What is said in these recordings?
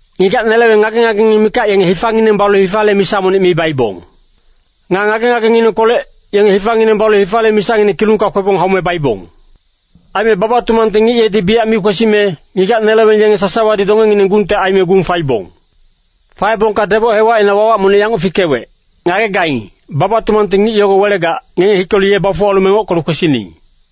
Ngigac-neleweng ngage-ngagengineng mikac yenge hifangineng balu hifale misa monic mi baibong. Nga ngage-ngagenginengkolec, yenge hifangineng balu hifale misangineng kilungka kwebong haume baibong. Aime baba-tumangte ngic yedi biyac mi kwesime, ngigac-neleweng yenge sasawadi dongengineng gungte aime gung faibong. “Faebongka deboc hewacina wawac monic yanguc fikewec, ‘Ngagegaing, baba-tumangte ngic yogo welegac, ngenge hikelu ye bafuwalu mengockelu kwesining.’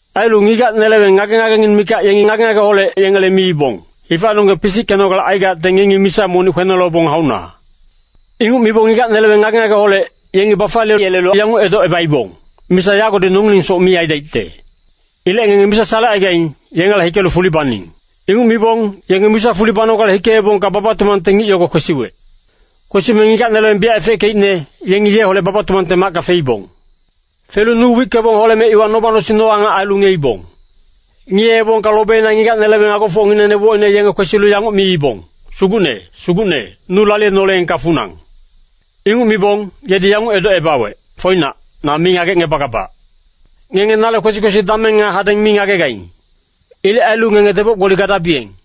Ailu ngigac-neleweng ngage-ngagengineng mikac yengi ngage-ngageholec yengele miibong, ‘Hifanonggeng pisickenogale aigacte ngengi misa monic kwenolebong hauna.’ “Inguc mibong ngigac-neleweng ngage-ngageholec, yengi bafaliyeyelelu yanguc edocebaibong, ‘Misa yagodi nongilengsoc mi aidaicte. Ilec ngenge misa salecaigaing, yengela hikelu fuli baning.’ “Inguc mibong, yenge misa fuli banogale hikeebongka baba-tumangte ngic yogo kwesiwec. Kwesime ngigac-neleweng biyac efeckeicne, yengi yeholec baba-tumangte macka feibong. Felu nu wickebong holeme iwa noba-nosing no-angac ailu ngiyeibong. “Ngiyeebongka lobeina ngigac-neleweng agofocngineng nebocine yenge kwesilu yanguc miibong, ‘Sugucne, Sugucne, nu laliyenoleengka funang.’ “Inguc mibong, yedi yanguc edocebawec, ‘Foinac, na mi ngagecngebagabac.’ “Ngenge nale kwesi-kwesi dameng nga hadeng mi ngagegaing. Ilec ailu ngenge deboc-gboli gadabiyeng.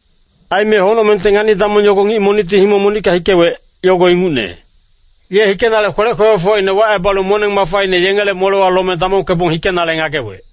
“Aime Honocmengte ngani-damong yogo ngic monicti himong monicka hikewec, yogo ingucne. Ye hikenale kwelec kwekwefocine wacebalu moneng-mafaine yengele molewa lome damongkebong hikenale ngagewec.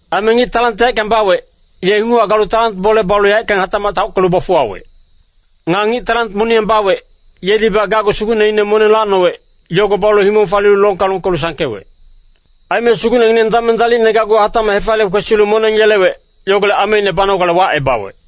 Aime ngic talant yaeckang bawec, ye inguchac galu talant bole balu yaeckang hatacmac taockelu bafuwawec. Nga ngic talant moniyang bawec, yedibac gacgu sugucneine moneng lacnowec, yogo balu himong falilu longka longkelu sangkewec. “Aime sugucnengineng dameng dalicne gacgu hatacmac hefaliye kwesilu moneng yelewec, yogolec ameine banogale wacebawec.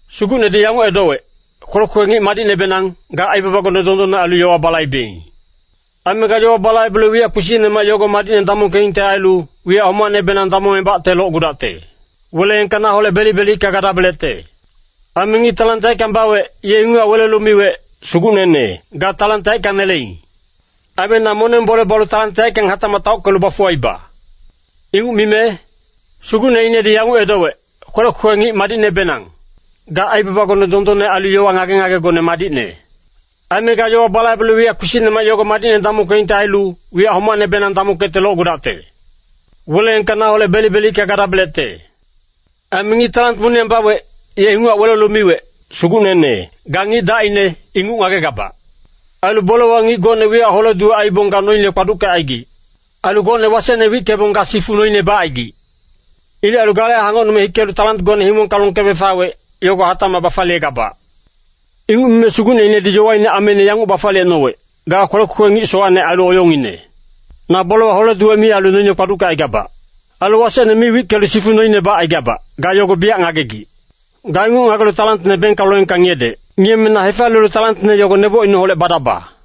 sugucnedi yanguc edowec, ‘Kwelec kwekwe ngic madicnebenang, ga aibabagone dondonne ailu yowa balaibeing. Aime ga yowa balaibelu wiyac kpisicnemac yogo madicne damongkeingte ailu, wiyac homacnebenang damongebacte locgudacte. Weleengka naholec belic-belicka gadabelecte.’ “Aime ngic talant yaeckang bawec, ye inguchac welelu miwec, ‘Sugucnene, ga talant yaeckang neleing. Aime na moneng bole balu talant yaeckang hatacmac taockelu bafuwaiba.’ “Inguc mime sugucneinedi yanguc edowec, ‘Kwelec kwekwe ngic madicnebenang. Ga aibabagone dondonne ailu yowa ngage-ngagegone madicne. Aime ga yowa balaibelu wiyac kpisicnemac yogo madicne damongkeingte ailu, wiyac homacnebenang damongkecte locgudacte. Weleengka naholec belic-belicka gadabelecte.’ “Aime ngic talant moniyang bawec, ye inguchac welelu miwec, ‘Sugucnene, ga ngic dacine, inguc ngagegabac. Ailu bolewa ngic gocne wiyac hole-duwec aibong ga noine kpaduckecaigic. Ailu gocne wasecne wickebong ga sifu noine bacaigic. Ilec ailu gale hangocnume hikelu talantgone himongka longkebe fawec, yogo hatacmac bafaliyegabac.’ “Inguc mime sugucneinedi yowaine ameine yanguc bafaliyecnowec, ‘Ga kwelec kwekwe ngic sowacne ailu oyongngine. Na bolewa hole-duwec mi ailu noine kpaduckecaigabac. Ailu wasecne mi wickelu sifu noine bacaigabac, ga yogo biyac ngagegic. Ga inguc ngagelu talantne bengka loengka ngiyedec. Ngiyeme na hefaliyelu talantne yogo nebocineholec badaba.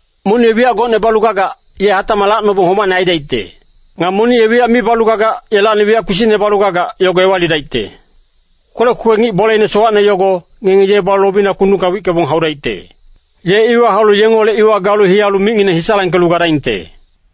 Monic ye wiyac gocne balu gagac, ye hatacmac lacnobong homacne aidaicte. Nga monic ye wiyac mi balu gagac, yelacni wiyac kpisicne balu gagac, yogo ewalidaicte. Kwelec kwekwe ngic boleine sowacne yogo, ngenge ye balu lobina kundungka wickebong haudaicte. Ye iwa haulu yengeholec iwa galu hiyalu micngineng hisalangkelu gadaingte.’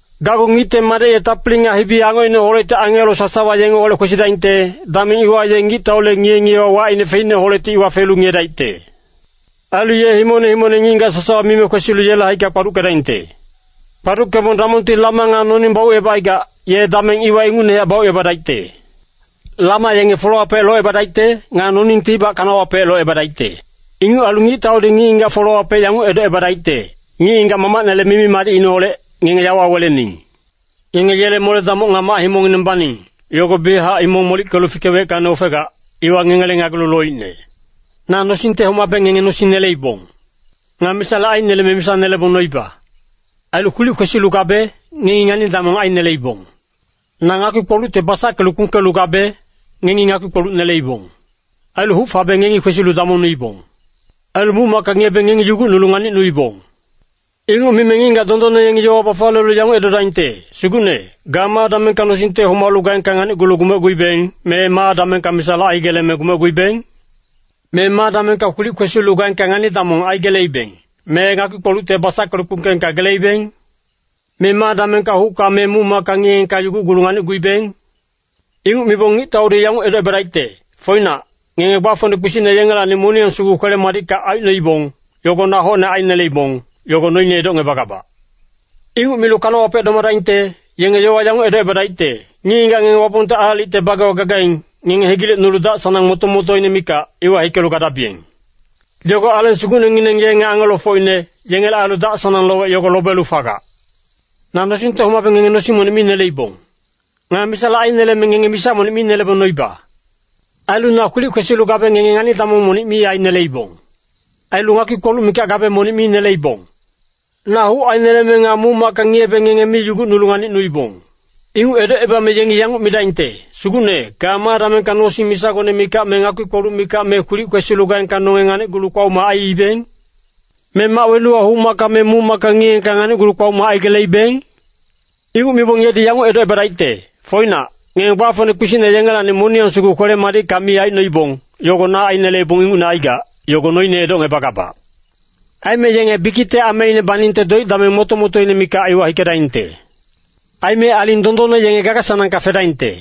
“Gacgu Ngicte Madec ye tapili nga hibi-angocineholecti angelo sasawa yengeholec kwesidaingte, dameng iwa ye ngictaule ngiye-ngiyewa wacine feicneholecti iwa felu ngiyedaicte. Ailu ye himongne himongne ngic-ngigac sasawa mime kwesilu yele haicka kpaduckedaingte. Kpaduckebong damongti lama nga noning baucebacaigac, ye dameng iwa ingucnehac baucebadaicte. Lama yenge folewapec locebadaicte, nga noningtibac kanawapec locebadaicte. “Inguc ailu ngictaudi ngic-ngigac folewapec yanguc edocebadaicte, ‘Ngic-ngigac Mamacnele mimi-madicineholec, ngenge yawa welening. Ngenge yele mole-damoc nga mac-himongngineng baning, yogo biyachac himong molickelu fikeweckacni ofegac, iwa ngengele ngagelu loicne. Na nosingte homabe ngenge nosing neleibong. Nga misale aineleme misa nelebong noiba. Ailu kwilic kwesilu gabe, ngengi ngani-damong aineleibong. Na ngakpi-kpolucte basackelu kpungkelu gabe, ngengi ngakpi-kpoluc neleibong. Ailu huc fabe ngengi kwesilu damongnuibong. Ailu muc-macka ngiyebe ngengi yugucnulu nganicnuibong.’ “Inguc mime ngic-ngigac dondonne yengi yowa bafaliyelu yanguc edodaingte, ‘Sugucne, ga ma damengka nosingte homalu gaengka nganicgulu gumecguibeng, me ma damengka misale aigeleme gumecguibeng? Me ma damengka kwilic kwesilu gaengka ngani-damong aigeleibeng, me ngakpi-kpolucte basackelu kpungkeengka geleibeng? Me ma damengka hucka me muc-macka ngiyeengka yugucgulu nganicguibeng?’ “Inguc mibong ngictaudi yanguc edocebadaicte, ‘Foinac, ngenge gbafocne kpisicne yengelacni moniyang sugu kwele-madicka aicnoibong, yogo na hocne aineleibong, yogo noine edocngebagabac.’ “Inguc milu kanawapec domadaingte, yenge yowa yanguc edocebadaicte, ‘Ngic-ngigac ngenge Wapongte aalicte bagewa gagaing, ngenge hegilecnulu dac-sanang moto-motoine mikac, iwa hikelu gadabiyeng. Yogo Aleng Sugucnengineng ye nga angelofocine, yengele ailu dac-sanang lowec yogo lobelu fagac. Na nosingte homabe ngenge nosing monic mi neleibong. Nga misale aineleme ngenge misa monic mi nelebong noiba. Ailu na kwilic kwesilu gabe ngenge ngani-damong monic mi aineleibong. Ailu ngakpi-kpoluc mikac gabe monic mi neleibong. Na huc aineleme nga muc-macka ngiyebe ngenge mi yugucnulu nganicnuibong.’ “Inguc edocebame yengi yanguc midaingte, ‘Sugucne, ga ma damengka nosing misagone mikac me ngakpi-kpoluc mikac me kwilic kwesilu gaengka nonge nganicgulu kpaoma aiibeng? Me mac wenuwa huc-macka me muc-macka ngiyeengka nganicgulu kpaoma aigeleibeng?’ “Inguc mibong yedi yanguc edocebadaicte, ‘Foinac, ngenge gbafocne kpisicne yengelacni moniyang sugu kwele-madicka mi aicnoibong, yogo na aineleibong ingucne aigac, yogo noine edocngebagabac.’ “Aime yenge bikicte ameine baningte doic dameng moto-motoine mikac iwa hikedaingte. Aime aling dondonne yenge gaga-sanangka fedaingte.”